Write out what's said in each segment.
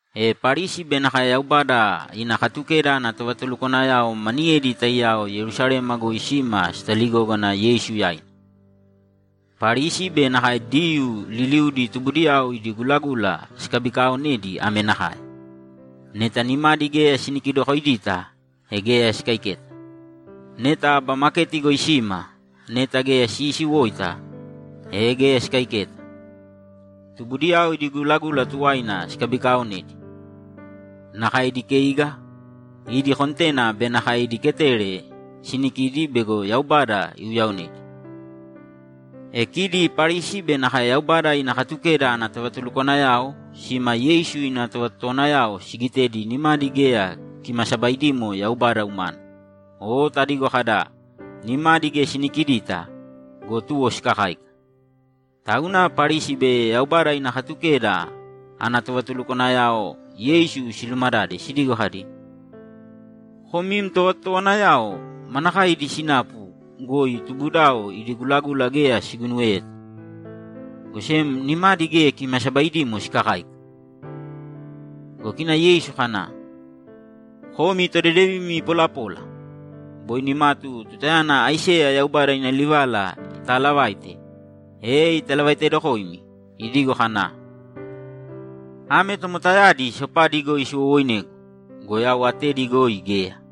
E Parisi be nakae Yaubada ina Katukeda ana tovatulukwanayao maniyedi taiyao Yerusalema goi sima sitaligógana Yeisu yaina. Parisi be nakae Diyuu liliudi tubudiyao idi gulagula sikabikaaonedi ame nakae: Neta nimadi geya sinikidokoidita, e geya sikaiketa. Neta aba maketi goi sima, neta geya siisiwoita, e geya sikaiketa. Tubudiyao idi gulagula tuwaina sikabikaaonedi. Nakae idi keiga, idi kontena be nakae idi keteri sinikidi bego Yaubada iuyaonedi. E kidi Parisi be nakae Yaubada ina Katukeda ana tovatulukwanayao sima Yeisu ina tovatotowanayao sigitedi nimadi geya kimasabaidimo Yaubada umana, o tadigo kada, ‘Nimadi geya sinikidita’ go, tuwo sikakáika. Tauna Parisi be Yaubada ina Katukeda ana tovatulukwanayao Yeisu silumadade sidigo kadi, ‘Kom im tovatotowanayao manakae idi sinapu goi tubudao idi gulagula geya siguinuweta, go sem nimadi geya kimasabaidimo sikakáika?’ Go kina Yeisu kana, ‘Komi todedevimi polapola! Boi nimatu tutayana Aiseya Yaubada ina livala itaalavaite, e italavaitedokoimi, idigo kana, “Ame tomotayadi sopadi goi siwowoinegu go, yau atedi goi geya.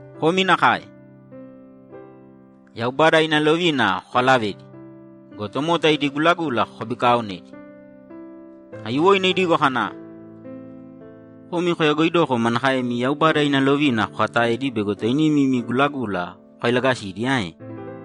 Komi nakae. Yaubada ina lovina kokalavedi go, tomota idi gulagula kokabikaaonedi.’ Aiyuwoina idigo kana, ‘Komi koyagoidoko manakaemi Yaubada ina lovina kokataedi bego toinimi imi gulagula kokailagasidi ae?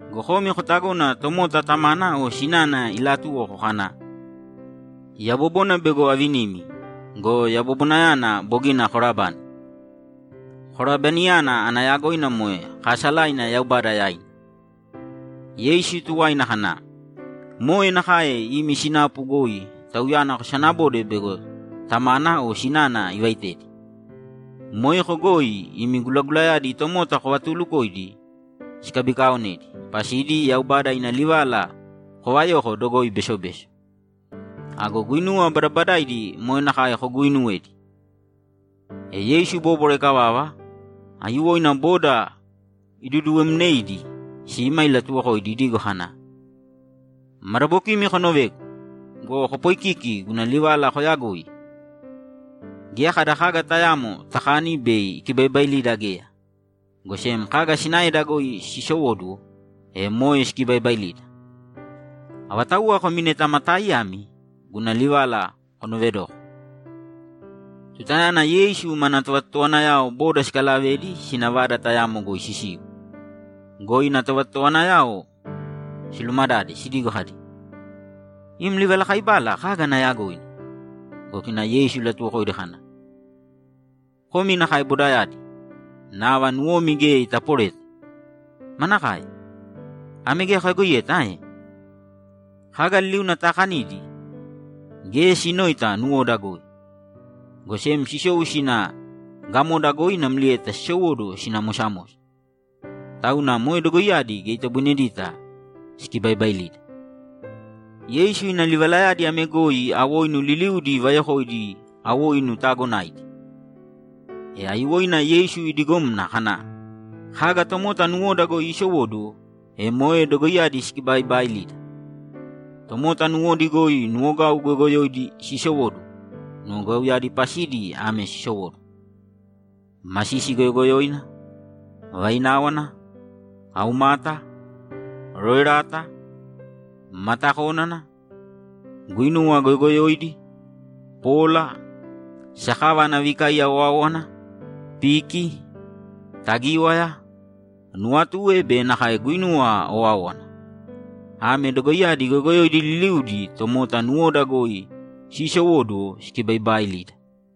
Go komi kotagona tomota tamana o sinana ilaatuwoko kana, “Yabobona bego avinim go, yabobonayana bogina korabani.”’ Korabaniyana ana yagoina moe kaasalaina Yaubada yaina. Yeisu tuwaina kana, ‘Moe nakae imi sinapu goi tauyana kosanabode bego tamana o sinana ivaitedi. Moeko goi imi gulagulayadi tomota kovatuulukoidi sikabikaaonedi pasidi Yaubada ina livala kovayoko dogoi besobeso. Ago guinuwa badabadaidi moe nakae koguuinuwedi.’ E Yeisu ibóbwara ikavava, aiyuwoina boda iduduwemneidi sima ilatuwokoidi idigo kana, ‘Madabokimi konovēgu go, kopoikīki guna livala koyagoi! Geya kada kaga tayamo takani bei ikibaibailida geya, go sem kaga sinaeda goi sisowóduwo, e moe sikibaibailida. [ Avatauwa komi neta ma taaiyami, guna livala konoovedōko!]’ Tutayana Yeisu mana tovatotowanayao boda sikalavedi sina vada tayamo goi sisiu go, ina tovatotowanayao silumadade sidigo kadi, ‘Im livalakaibala kaga ana yagoina?’ Go kina Yeisu ilatuwokoidi kana, ‘Komi nakae bodayadi, nava nuwomi geya itaporeta? Manakae? Ame geya koyagoiyeta ae? Kaga liliuna taakanidi, geya sinoita nuwoda goi, go sem sisou sina gamoda goi namlieta sisowóduwo sina mosamosa. Tauna moe dogoiyadi geya itoboinedita sikibaibailida.’ Yeisu ina livalayadi ame goi awoinu liliudi ivayokoidi awoinu taagonaidi. E aiyuwoina Yeisu idigomna kana, ‘Kaga tomota nuwoda goi siisowóduwo, e moe dogoiyadi sikibaibaailida. Tomota nuwodi goi nuwogau goyogoyoidi siisowóduwo. Nuwogauyadi pasidi ame sisowóduwo: Masisi goyogoyoina, vaináwana, aumata, roerata, matakónana, guinuwa goyogoyoidi, pola, sakava ana vikaiya owáowana, piki, tagíwaya, nuwatue be nakae guinuwa owáowana. Ame dogoiyadi goyogoyoidi liliudi tomota nuwoda goi siisowóduwo sikibaibaailida.’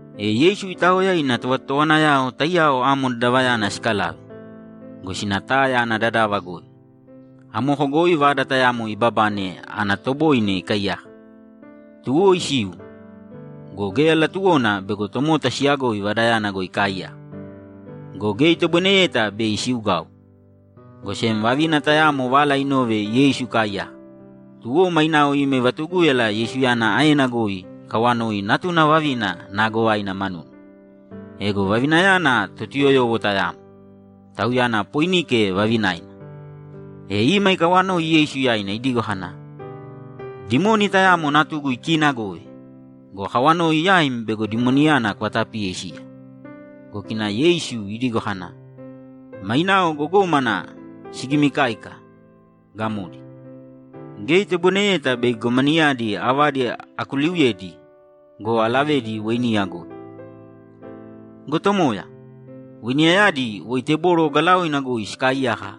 E Yeisu itaoya ina tovatotowanayao taiyao amo dadavayana sikalave go, sina Taya ana dadava goi. Amoko goi vada tayamo ibabane ana toboine ikaiyaka. Tuwo isiu go, geya latuwona bego tomota siyagoi vadayana goi ikaaiyaka. Go geya itoboineyeta bei isiugau, go sem vavina tayamo vala inove Yeisu ikaaiyaka, tuwo mainao ima ivatugúyala Yeisuyana aena goi ikawanoi natuna vavina naagovaina manuna. Ego vavinayana Totuyoyowo tayamo, tauyana Poinike vavinaina. E ima ikawanoi Yeisu yaina idigo kana, ‘Dimoni tayamo natugu ikiinagove go, akawanoi yaim bego dimoniyana kuvatapiye isiya.’ Go kina Yeisu idigo kana, ‘Mainao gogómana sigimikáika, gamodi. Geya itoboineyeta bei gogomanayadi avadi akuliuyedi go, alavedi weiniya goi.’ ‘Go Tomoya, weiniyayadi woi teboro ogalaoina goi sikaaiyaka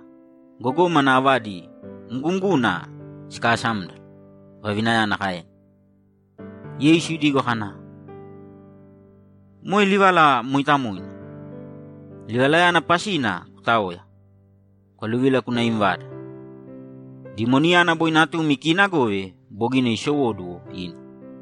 gogómana avadi mgumguna siikasámdala’, vavinayana kaena. Yeisu idigo kana, ‘Moe livala mooitamoina! Livalayana pasina kutāoya, kwaluvīla kūna im vada. Dimoniyana boi natum ikiinagove bogina isowóduwo ina.’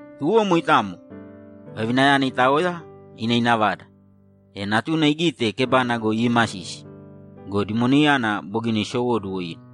Tuwo moitamo, vavinayana itaoya ina ina vada, e natuna igite kebana goi iimasisi go, dimoniyana bogina isowóduwo ina.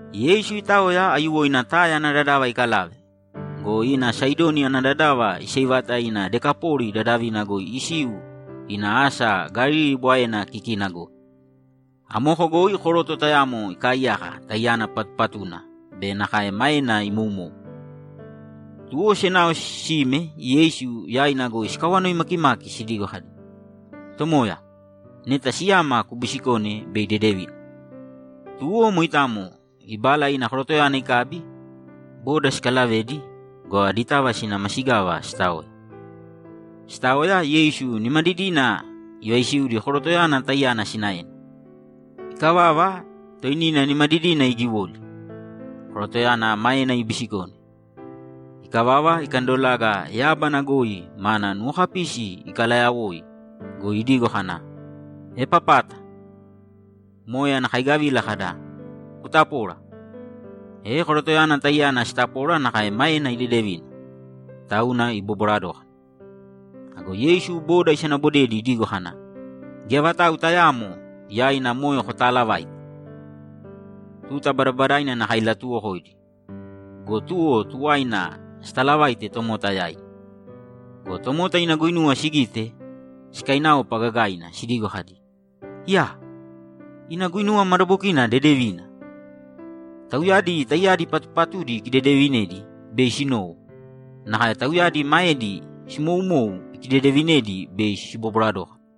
Yeisu itaoya aiyuwoina Taya ana dadava ikalave go, ina Saidoni ana dadava iseivata ina Dekapoli dadavina goi isiu ina asa Galili Bwaena kikina goi. Amoko goi koroto tayamo ikaaiyaka taiyana patupatuna be nakae maena imoumou. Tuwo senao sime Yeisu yaina goi sikawanoi makimaki sidigo kadi, ‘Tomoya, neta siyama kubisikōne bei idedevina.’ Tuwo moitamo ibala ina korotoyana ikabi, boda sikalavedi go, aditava sina masigava sitaoya. Sitaoya, Yeisu nimadidina ivaisiudi korotoyana taiyana sinaena. Ikavava, toinina nimadidina igiwoli, korotoyana maena ibisikone. Ikavava, ikandolaga yábana goi mana nuwokapisi ikalayawoi go, idigo kana, ‘Epapāta!’ Moe ana kaigavila kada, ‘Kutapōra!’ E korotoyana taiyana sitapora nakae maena idedevina, tauna ibobwara dókana. Ago Yeisu boda isanabodedi idigo kana, ‘Geya vatau tayaamo yaina moe kotaalavāite!’ Tuta badabadaina nakae ilatuuwokoidi go, tuwo tuwaina sitaalavaite tomota yaidi. Go tomota ina guinuwa sigite, sikainaopa gagaina sidigo kadi, ‘Iyaa! Ina guinuwa madabokina dedevina! Tauyadi taiyadi patupatudi ikidedeevinedi bei sinowo, nakae tauyadi maedi simoumou ikidedeevinedi bei sibobwara dókana.’